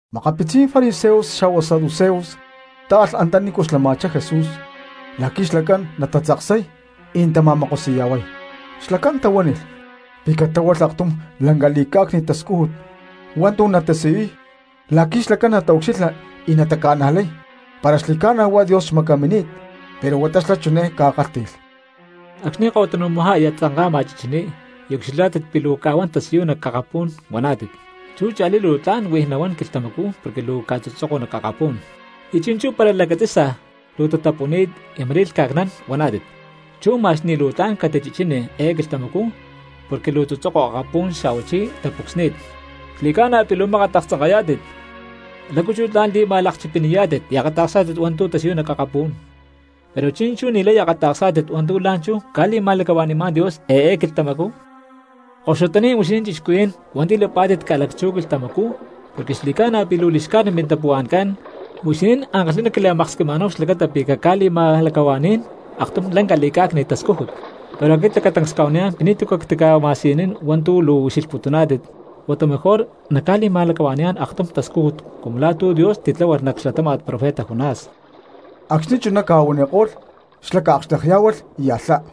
Makapitzí̠n fariseos xa̠huá saduceos táalh antanícu xlama̠chá Jesús la̠qui̠ xlacán natatzaksay y natama̠mokosi̠ya̠huay; xlacán tahuánilh pi̠ catláhualh aktum lanca li̠cá̠cni̠t tascújut hua̠ntu̠ natasiyuy la̠qui̠ xlacán nataucxilha y nataca̠najlay para xli̠ca̠na huá Dios xmacamini̠t. Pero huata xlá chiné ca̠kálhti̠lh: —Acxni̠ ko̠tanu̠majá aya tzanka̠ma chichiní y ucxilhá̠tit pi̠ luu ca̠huán tasiyuy nac akapú̠n huaná̠tit: “Chú cha̠lí luu tla̠n huij nahuán quilhtamacú porque luu ca̠tzutzoko nac akapú̠n.” Y chi̠nchú para lacatzi̠sa luu tatapuni̠t y ma̠rí lhca̠cnán, huaná̠tit: “Chú ma̠x ni̠ luu tla̠n catichichíni eé quilhtamacú porque luu tzutzoko akapú̠n xa̠huachí tapucsni̠t.” ¡Xli̠ca̠na pi̠ luu mákat aktzanká̠tit! ¿Lácu chú tla̠n li̠ma̠lakchipini̠yá̠tit y akata̠ksá̠tit hua̠ntu̠ tasiyuy nac akapú̠n, pero chi̠nchú ni̠lay akata̠ksá̠tit hua̠ntu̠ la̠nchú ca̠li̠ma̠lacahua̠ni̠má̠n Dios eé quilhtamacú? ¡Koxutaní̠n huixinín cristianos hua̠nti̠ lapá̠tit ca̠lacchú quilhtamacú porque xli̠ca̠na pi̠ luu li̠xcájnit mintapuhua̠ncán, huixinín ankalhi̠ná quila̠maksquima̠náhu xlacata pi̠ cacca̠li̠ma̠lacahua̠ní̠n aktum lanca li̠cá̠cni̠t tascújut! Pero aquit lacatancs cca̠huaniyá̠n pi̠ ni̠tu̠ cactica̠laca̠xtlanín hua̠ntu̠ luu ucxilhputuná̠tit, huata mejor huá nacca̠li̠ma̠lacahua̠ni̠yá̠n aktum tascújut cumu la̠ tu̠ Dios titláhualh nac xlatáma̠t profeta Jonás. Acxni̠ chuná ca̠huaniko̠lh xla̠ ca̠akxtekyá̠hualh y alhá.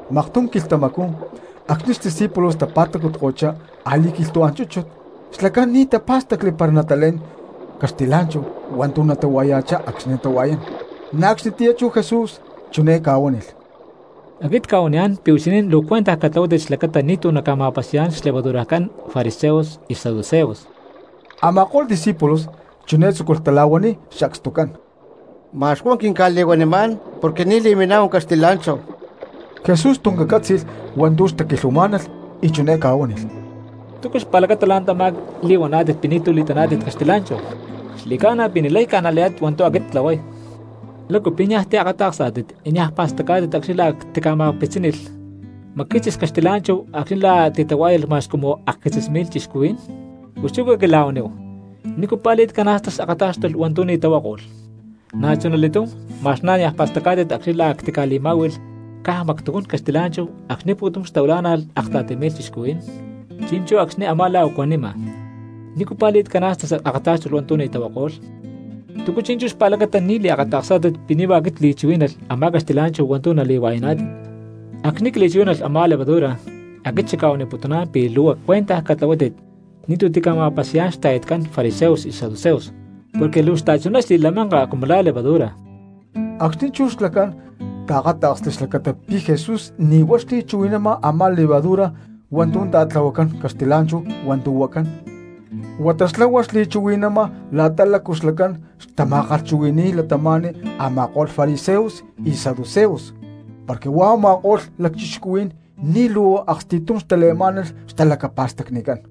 Maktum quilhtamacú acxni̠ discípulos tapa̠tacutko̠chá a̠li̠quilhtu̠án chúchut xlacán ni̠ tapá̠stacli para natalé̠n caxtilá̠nchahu hua̠ntu̠ natahuaya̠chá acxni̠ natahua̠yán. Na̠ acxnitiyá chú Jesús chiné ca̠huánilh: —Aquit cca̠huaniyá̠n pi̠ huixinín luu cuentaj catlahuátit xlacata ni̠tu̠ naca̠ma̠pasi̠yá̠n xlevadurajcán fariseos y saduceos. Ama̠ko̠lh discípulos chiné tzúculh tala̠huaniy sacstucán: —Ma̠x huá quinca̠li̠huanimá̠n porque ni̠ li̠miná̠hu caxtilá̠nchahu. Jesús tuncán cátzi̠lh hua̠ntu̠ xtaquilhuamá̠nalh y chiné ca̠huánilh: —¿Túcu xpa̠lacata la̠ntamá li̠huaná̠tit pi̠ ni̠tu̠ li̠taná̠tit caxtilá̠nchahu? ¡Xli̠ca̠na pi̠ ni̠lay ca̠najlayá̠tit hua̠ntu̠ aquit ctlahuay! ¿Lácu pi̠ nia̠ tiakata̠ksá̠tit y niaj pa̠stacá̠tit acxni̠ lá a̠ ctica̠ma̠kpitzínilh macquitzis caxtilá̠nchahu acxni̠ la̠ a̠ titahuá̠yalh ma̠x cumu akquitzis mi̠lh cristianos? Pus chú caquila̠huaníhu, ¿nícu pa̠li̠t cana̠stas akatá̠xtulh hua̠ntu̠ ni̠ tahuako̠lh? Na̠chunali̠túm ma̠x na̠ niaj pa̠stacá̠tit acxni̠ la̠ a̠ ctica̠li̠má̠hui̠lh caj mactujún caxtilá̠nchahu acxni̠ pu̠tum xtahuilá̠nalh akta̠ti mi̠lh cristianos, chi̠nchú acxni̠ a̠má lá u̠cuanima, ¿nícu pa̠li̠t cana̠stas akatá̠xtulh hua̠ntu̠ ni̠ tahuako̠lh? ¿Túcu chi̠nchú xpa̠lacata ni̠ liakatá̠kstit pi̠ ni̠ huá aquit cli̠chuhuí̠nalh a̠má caxtilá̠nchahu hua̠ntu̠ nali̠hua̠yaná̠tit? Acxni̠ cli̠chuhuí̠nalh a̠má levadura, aquit xacca̠huaniputuná̠n pi̠ luu cuentaj catlahuátit ni̠tu̠ tica̠ma̠pasi̠yá̠n xta̠yatcán fariseos y saduceos porque luu xta̠chuná xli̠lamanka cumu lá levadura. Acxnicú chú xlacán taakáta̠ksli xlacata pi̠ Jesús ni̠ huá xli̠chuhui̠nama a̠má levadura hua̠ntu̠ ta̠tlahuacán caxtilá̠nchahu hua̠ntu̠ huacán, huata huá xlá xli̠chuhui̠nama la̠ta lácu xlacán xtama̠kalhchuhui̠ni̠y cristianos a̠ma̠ko̠lh fariseos y saduceos, porque huá u̠ma̠ko̠lh lacchixcuhuí̠n ni̠ luu aksti̠tum xtale̠má̠nalh xtalacapa̠stacnicán.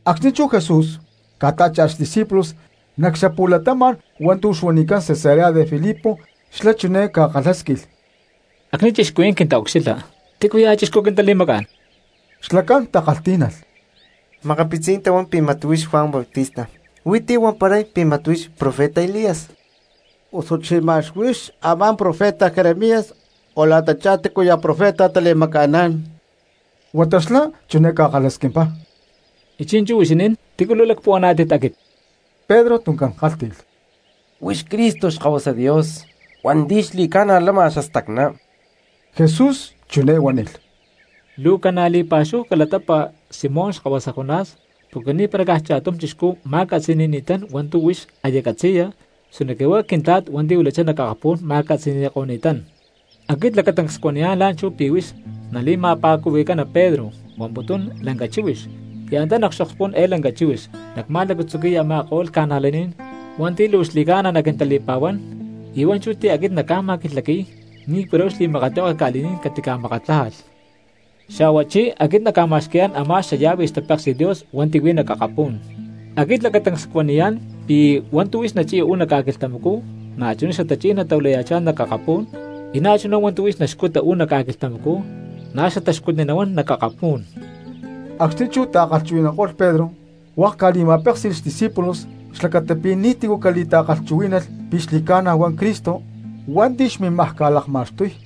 Acxni̠ chú Jesús ca̠tá̠cha̠lh xdiscípulos nac xapu̠latama̠n hua̠ntu̠ xuanicán Cesarea de Filipo xlá chiné ca̠kalhásquilh: —Acxni̠ cristianos quintaucxilha, ¿tícuya̠ chixcú quintali̠macá̠n? Xlacán takalhtí̠nalh: —Makapitzí̠n tahuán pi̠ mat huix Juan Bautista, hui̠ntí huamparay pi̠ mat huix profeta Elías, osuchi mat huix a̠má profeta Jeremías, o la̠tachá tícuya̠ profeta tali̠maca̠ná̠n. Huata xlá chiné ca̠kalhasquimpá: —Y chi̠nchú huixinín, ¿tícu luu lacpuhuaná̠tit aquit? Pedro tuncán kálhti̠lh: —¡Huix Cristo Xkahuasa Dios hua̠nti̠ xli̠ca̠na lama xastacná! Jesús chiné huánilh: —Luu ca̠na̠ li̠pa̠xúhu calatapa Simón xkahuasa Jonás porque ni̠para caj cha̠tum chixcú ma̠catzi̠ni̠ni̠tán hua̠ntu̠ huix aya catzi̠ya, sinoque huá Quintla̠t hua̠nti̠ huilachá nac akapú̠n ma̠catzi̠ni̠ko̠ni̠tán. Aquit lacatancs cuaniyá̠n la̠nchú pi̠ huix nali̠ma̠pa̠cuhui̠cana Pedro (huamputún lanca chíhuix) y antá nac xokspú̠n eé lanca chíhuix nacma̠lacatzuqui̠y a̠ma̠ko̠lh cristianos hua̠nti̠ luu xli̠ca̠na naquintali̠pa̠huán; y hua̠nchú ti̠ aquit nacca̠ma̠quilhaqui̠y ni̠para huá xli̠makatlihueke ca̠li̠ní̠n catimakatlájalh. Xa̠huachí aquit nacma̠xqui̠yá̠n a̠má xallave xtapéksi̠t Dios hua̠nti̠ huí nac akapú̠n. Aquit lacatancs cuaniyá̠n pi̠ hua̠ntu̠ huix nachi̠ya uú nac ca̠quilhtamacú na̠chuná xatachí̠n natahuilaya̠chá nac akapú̠n, y na̠chuná hua̠ntu̠ huix naxcuta uú nac ca̠quilhtamacú na̠ xataxcutni nahuán nac akapú̠n. Acxni̠ chú ta̠chuhui̠nanko̠lh Pedro, hua̠k ca̠li̠ma̠péksi̠lh xdiscípulos xlacata pi̠ ni̠tícu catali̠ta̠chuhuí̠nalh pi̠ xli̠ca̠na huá Cristo hua̠nti̠ xmimaj ca̠lakma̠xtuy.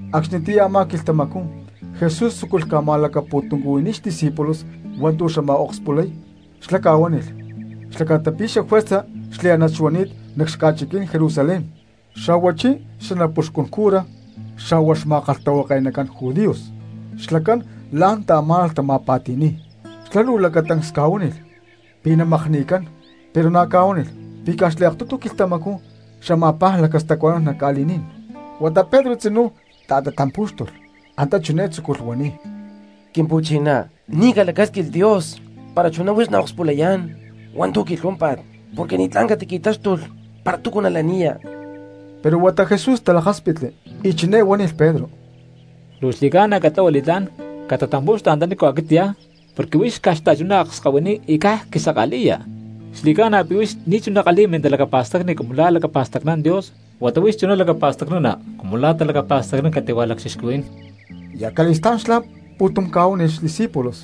Acxnitiyá a̠má quilhtamacú Jesús luu tzúculh ca̠ma̠lacapu̠tuncuhui̠niy xdiscípulos hua̠ntu̠ xamaj akspulay, xlá ca̠huánilh xlacata pi̠ juerza xliánat xuani̠t nac xaca̠chiquí̠n Jerusalén, xa̠huachí xanapuxcún cura xa̠huá xma̠kalhtahuake̠nacán judíos xlacán la̠n xtaamá̠nalh tama̠pa̠ti̠ni̠y. Xlá luu lacatancs ca̠huánilh pi̠ namakni̠cán pero na̠ ca̠huánilh pi̠ caj xliaktutu quilhtamacú xama̠paj lacastacuanán nac ca̠li̠ní̠n. Huata Pedro tzinú ta̠tatampú̠xtulh y antá chiné tzúculh huaniy: —Quimpu̠chiná, ¡ni̠ calacásquilh Dios para chuná huix naakspulayá̠n hua̠ntu̠ quilhuámpa̠t! Porque ni̠tlá̠n catiqui̠táxtulh para túcu nalaniya. Pero huata Jesús talakáspitli y chiné huánilh Pedro: —¡Luu xli̠ca̠na catlahua li̠tlá̠n catatampu̠xtu antanícu aquit cyá porque huix xta̠chuná akskahuiní y caj quisaka̠li̠ya! Xli̠ca̠na pi̠ huix ni̠chuná kalhi̠ya mintalacapa̠stacni cumu lá lacapa̠stacnán Dios huata huix chuná lacapa̠stacnana cumu lá talacapa̠stacnán cati̠hua lacchixcuhuí̠n. Y acali̠stá̠n xlá pu̠tum ca̠huánilh xdiscípulos: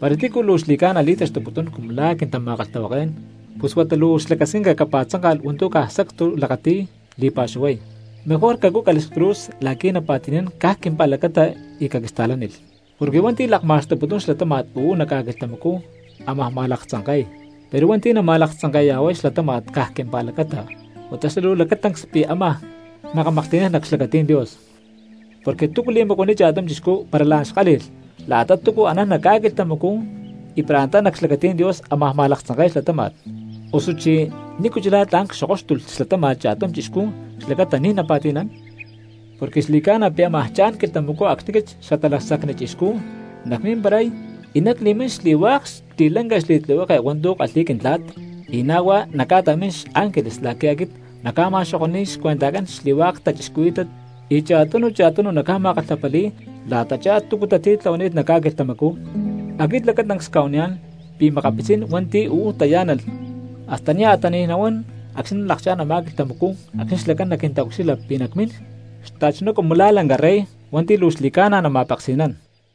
—Para tícu luu xli̠ca̠na li̠taxtuputún cumu lá quintama̠kalhtahuaké̠n, pus huata luu xlacasquinca capa̠tzánka̠lh hua̠ntu̠ caj sacstu lakati̠y li̠pa̠xuhuay, mejor cacúcalh xcruz la̠qui̠ napa̠ti̠nán caj quimpa̠lacata y caquista̠lánilh. Porque hua̠nti̠ lakma̠xtuputún xlatáma̠t uú nac ca̠quilhtamacú ámaj ma̠laktzanke̠y; pero hua̠nti̠ nama̠laktzanke̠ya̠huay xlatáma̠t caj quimpa̠lacata, huata xla̠ luu lacatancs pi̠ ama̠paj makamaklhti̠nán nac xlacatí̠n Dios. Porque ¿túcu li̠macuaniy cha̠tum chixcú para la̠n xkálhi̠lh la̠ta túcu anán nac ca̠quilhtamacú y para antá nac xlacatí̠n Dios ámaj ma̠laktzanke̠y xlatáma̠t? ¿Osuchí nícu chulá tla̠n cxokóxtulh xlatáma̠t cha̠tum chixcú xlacata ni̠ napa̠ti̠nán? Porque xli̠ca̠na pi̠ ámaj cha̠n quilhtamacú acxni̠ aquit Xatalacsacni Chixcú nacmimparay y nacli̠mín xli̠hua̠k xli̠lanca xli̠tlihueke hua̠ntu̠ kalhi̠y Quintla̠t, y na̠ hua̠k nacca̠ta̠mín xángeles la̠qui̠ aquit nacca̠ma̠xoko̠ni̠y xcuentajcán xli̠hua̠k cristianos y cha̠tunu cha̠tunu nacca̠ma̠kalhapali̠y la̠tachá túcu tatitlahuani̠t nac ca̠quilhtamacú. Aquit lacatancs cca̠huaniyá̠n pi̠ makapitzí̠n hua̠nti̠ uú tayá̠nalh hasta nia̠ tani̠y nahuán acxni̠ nalakchá̠n a̠má quilhtamacú acxni̠ xlacán naquintaucxilha pi̠ nacmín xta̠chuná cumu la̠ lanca rey hua̠nti̠ luu xli̠ca̠na nama̠peksi̠nán.